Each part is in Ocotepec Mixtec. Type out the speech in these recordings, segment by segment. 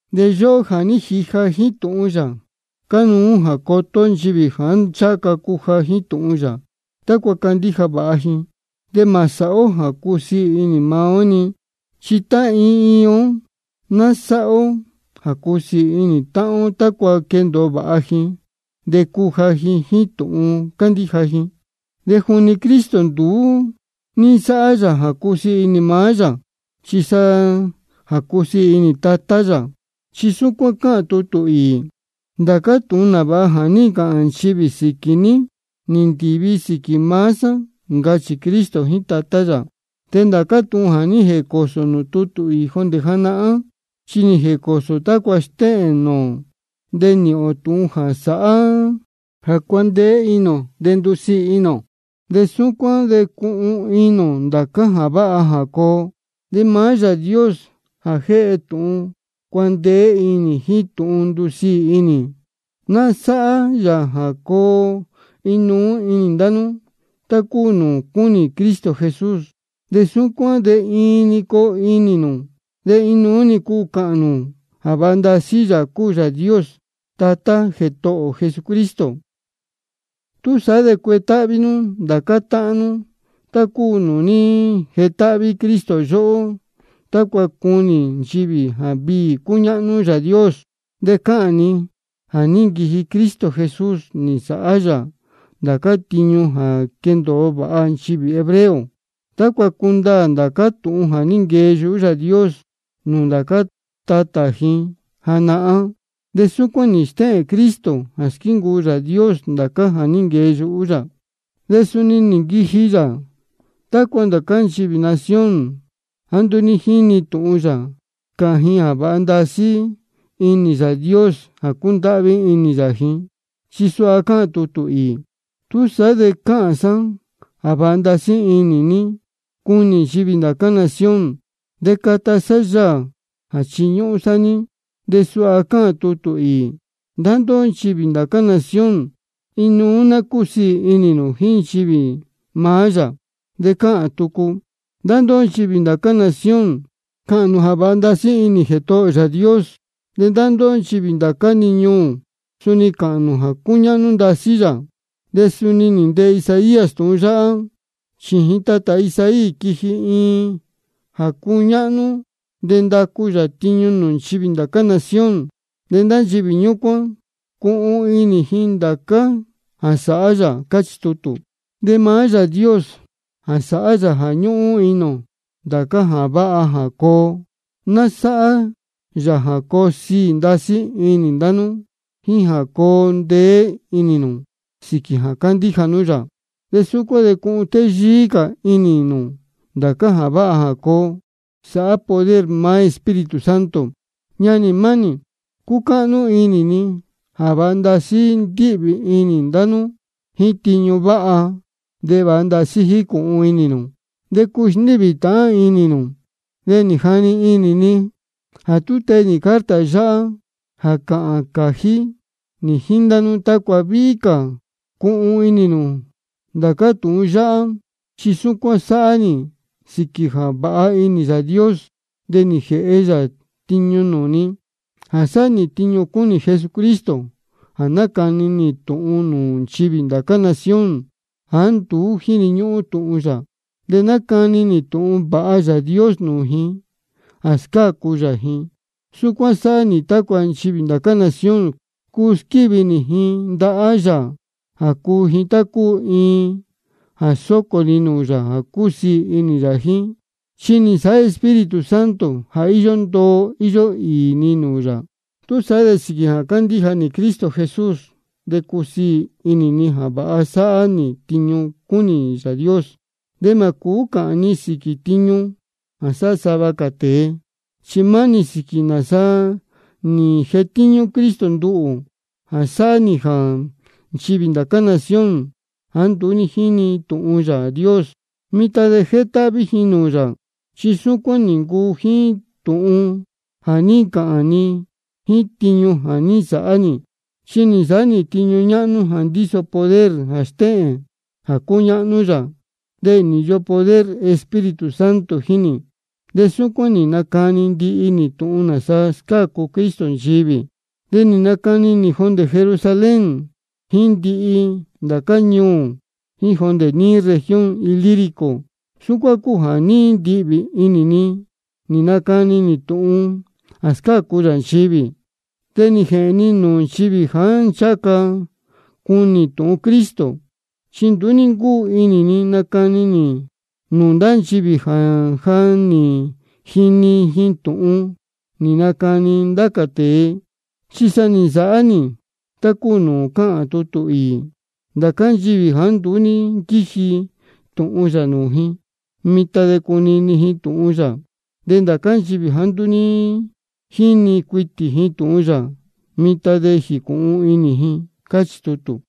De yóhó jā ní jija jíín tūhun yā, cánuú jā coto ó nchivī jāá ncháha ca cuja jíín tūhun yā, tácua candíja vāha ji. De mā sāhá ó jā cusiī inī maá ó-ni. Chi tá iin iin ó ná sáhá ó jā cusiī inī táhán ó, tácua quendōo vāha ji de cuja ji jíín tūhun cándíja ji. Chi juni Cristo nduú ní nsáhá yā jā cusiī inī maá yā, chi sa jā cusiī inī Tatá yā. Chi súcuán cáhān tutū īī: Ndācá tūhun nāvāha jā ní ncāhān ndá nchivī sīquī ní, nī ndīvi sīquī maá sá, ncachī Cristo jíín Tatá yā. Chi ndācá tūhun jā ní jēcōsō nūū tutū īī jondē janahán, chi nī jēcōsō tácua stéhēn nūū ō, de nīhīn ō tūhun jā sāhá jā cuandeé inī ō de ndusiī inī ō. De súcuán de cuhun inī ō ndācá jā váha jā coo. De maá Yāā Dios jā jéhe tūhun cuandeé inī jíín tūhun ndusiī inī, ná sáhá yā jā coo inuú inī ndá nú, tá cúu nūū cúnī Cristo Jesús. De súcuán de iin-ni coo nú de inuú-ni cuu cāhān nū jā vāha ndasí Yāā cúu Yāā Dios, Tatá Jētohō ō Jesucristo. Túsaá de cuetáhví nú ndācá táhán nú, tá cúu nūū ní jetáhví Cristo yóhó, tácua cunī nchivī jā viī cúñáhnú Yāā Dios. Chi cáhān ni jā ní nquiji Cristo Jesús, nī nsāhá yā ndācá tiñu jā quendōo vāha nchivī hebreo, tácua cundaā ndācá tūhun jā ní nquee yuhú Yāā Dios nūū ndācá tatā ji janahán. De súcuán nī stéhēn Cristo jā squíncuu Yāā Dios ndācá jā ní nquee yuhú yā. De suni nī nquiji yā tácua nchivī ndá cā nación jāá nduú jínī tūhun yā, cāhān ji jā vāha ndasí inī Yāā Dios jā cúndáhví inī yā ji. Chi suha cáhān tutū īī: Túsaá de cāhān sá jā vāha ndasí inī ní, cuni nchivī ndācá nación, de cata sá yaā jā chiñúhún sá ní. De suha cáhān tucu tutū īī: Ndá ndóhó nchivī ndācá nación, inuú ná cúsiī inī nū jíín nchivī maá yā. De cáhān tucu: Ndá ndóhó nchivī ndācá nación, cāhān nū jā vāha ndasí inī Jētohō ō Yāā Dios. De ndá ndóhó nchivī ndācá-ni ñuū, suni cāhān nū jā cúñáhnú ndasí yā. De suni nī ntee Isaías tūhun yáhá: Chījin tatā Isaí quiji iin jā cuñáhnú, de ndacu yā tiñu nūū nchivī ndācá nación. De ndá nchivī ñúcuán chi cuhun inī ji ndācá jā sāhá yā. Cáchī tutū. De maá Yāā Dios jā sáhá jā ñúhún inī ō ndācá jā váha jā coo, ná sáhá yā jā coo siī ndasí inī ndá nú jíín jā coo ndeé inī nū sīquī jā cándíja nú yā. De súcuán de cuhun téyíí cā inī nū ndācá jā váha jā coo, sāhá poder maá Espíritu Santo. Ñanī mánī, cúcáhnú inī ni jā vāha ndasí ndíhvī inī ndá nú jíín tiñu váha, de vāha ndasí jícūhun inī nū, de cúu sndíhvī tāhán inī nū. De nī jani inī ni jā tee nī carta yáhá jā cāhān cājí nī jíín ndá nú, tácua víhí cā cuhun inī nū ndācá tūhun yáhá. Chi súcuán sáhá nī sīquī jā vāha inī Yāā Dios, de nī jēhe yā tiñu nūū ni jā sáhá nī tiñu cúnī Jesucristo jā nácani nī tūhun nūū nchivī ndācá nación jāá nduú jínī tūhun yā. De nácani nī tūhun vāha Yāā Dios nūū ji jā scácu yā ji. Súcuán sáhá nī tácua nchivī ndācá nación, cuu squívi nī ji ndahá yā jā cúu ji tá cúu iin jā sócō ni nūū yā jā cúsiī inī yā jíín. Chi nī nsāhá Espíritu Santo jā íyó ndoo íyó īī ji nūū yā. Túsaá de sīquī jā cándíja nī Cristo Jesús, de cúsiī inī ni jā vāha sáhá nī tiñu cúnī Yāā Dios. Chi mā cūú cāhān ni sīquī tiñu jā sáhá sava cā tēe, chi maá-ni sīquī nāsa nī jetíñú Cristo nduhū jā sāhá nī jā nchivī ndācá nación jāá nduú ní jínī tūhun Yāā Dios, mitan de jétáhví ji nūū yā. Chi súcuán nī ncuu jíín tūhun jā ní ncāhān ni jíín tiñu jā ní nsāhá nī. Chi nī nsāhá nī tiñu ñáhnú jā ndíso poder jā stéhēn jā cúñáhnú yā, de nī īyo poder Espíritu Santo jíín nī. De súcuán nī nacani ndihi nī tūhun nāsa scácu Cristo nchivī. De nī nacani nī jondē Jerusalén, jíín ndihi ndācá ñuū, jíín jondē níí región Ilírico. Súcuán cúu jā ní ndihvī inī ni nī nacani nī tūhun jā scácu yā nchivī. De nī jēhēn ni nūū nchivī jāá ncháha ca cuni tūhun Cristo, chi nduú ní ncúu inī ni nacani nī nūū ndá nchivī jā ja nī jini ji tūhun nī nacani ndá cā tēe. Chi sa nī nsāhá nī tá cúu nūū cáhān tutū īī: Ndācá nchivī jāá nduú ní nquíji tūhun yā nūū ji, mitan chi cunī ji tūhun yā, de ndācá nchivī jāá nduú ní jíni cuitī tūhun yā, mitan chi jīcūhun inī ji. Cáchī tutū.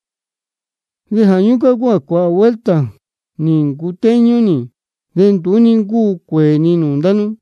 De jā ñúcuán cúu jā cuāhā vuelta nī ncutéñú nī, de nduú ní ncúu cuēē ni nūū ndá nú.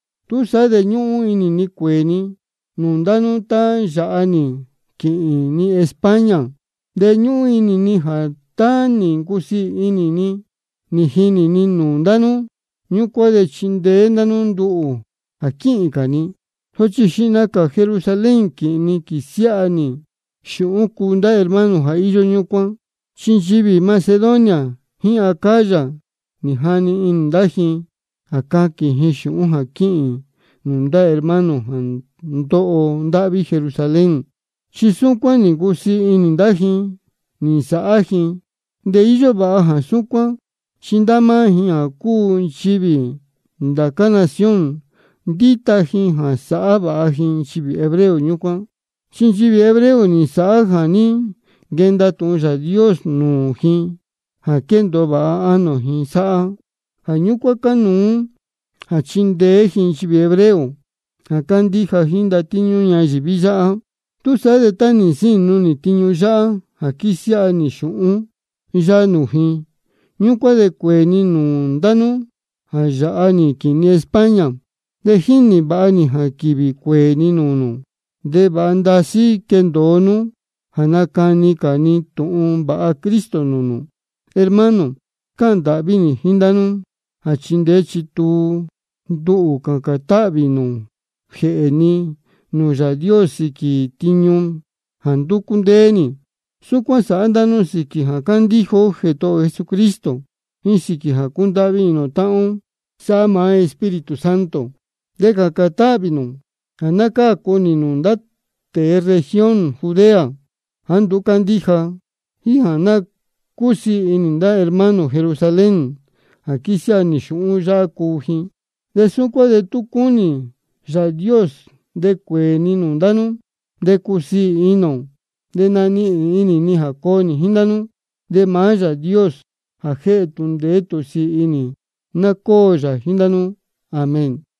Túsaá de ñúhún inī ni cuēē ni nūū ndá nú tá yāha nī quīhīn ni España. De ñúhún inī ni jā tá nī ncusiī inī ni jā ní jinī ni nūū ndá nú, ñúcuán de chindeé ndá nú nduhū jā quíhīn cā ni. Sochi xihna cā Jerusalén quīhīn ni quīsiáha nī xūhún cuu ndá hermano jā íyó ñúcuán. Chi nchivī Macedonia jíín Acaya nī jani inī ndá ji jā caquīn ji xūhún jā quíhīn nūū ndá hermano jā ndóho ndáhví Jerusalén. Chi súcuán nī ncusiī inī ndá ji nī nsāhá ji. De íyó vāha jā súcuán, chi ndá máá ji jā cúu ji nchivī ndá cā nación, ndíta ji jā sāhá vāha ji nchivī hebreo ñúcuán. Chi nchivī hebreo nī nsāhá jā ní nquenda tūhun Yāā Dios nūū ji jā quéndōo vāha ánō ji sáhá. Jā ñúcuán cánuú jā chindeé ji nchivī hebreo jā cándíja jíín ndatíñú ñayīví yáhá. Túsaá de tá nī nsínu nī tiñu yáhá jā quísiáha nī xūhún yáhá nūū ji, ñúcuán de cuēē ni nūū ndá nú jā yāha nī quīhīn ni España. De jínī vāha nī jā quīvī cuéē ni nūū nū, de vāha ndasí quendōo nú jā nacani cā ni tūhun vāha Cristo nūū nū. Hermano, cáhān ndāhví nī jíín ndá nú jā chindeé chítuu nú nduhū cācān táhvī nū jēhē ni nūū Yāā Dios sīquī tiñu jā ndúcú ndéé nī. Súcuán sāhá ndá nú sīquī jā cándíja ó Jētohō ō Jesucristo, jíín sīquī jā cúndáhví inī ō táhán ó sáhá maá Espíritu Santo. De cācān táhvī nū jā ná cácu nī nūū ndá tēe región Judea jāá nduú cándíja, jíín jā ná cúsiī inī ndá hermano Jerusalén jā quísiáha nī xūhún yáhá cuu ji. De súcuán de tú cúnī Yāā Dios de cuēē ni nūū ndá nú, de cusiī inī ō, de nanihīn inī ni jā coo nī jíín ndá nú. De maá Yāā Dios jā jéhe tūhun ndeé tūhun sīī inī, ná cóo yā jíín ndá nú. Amén.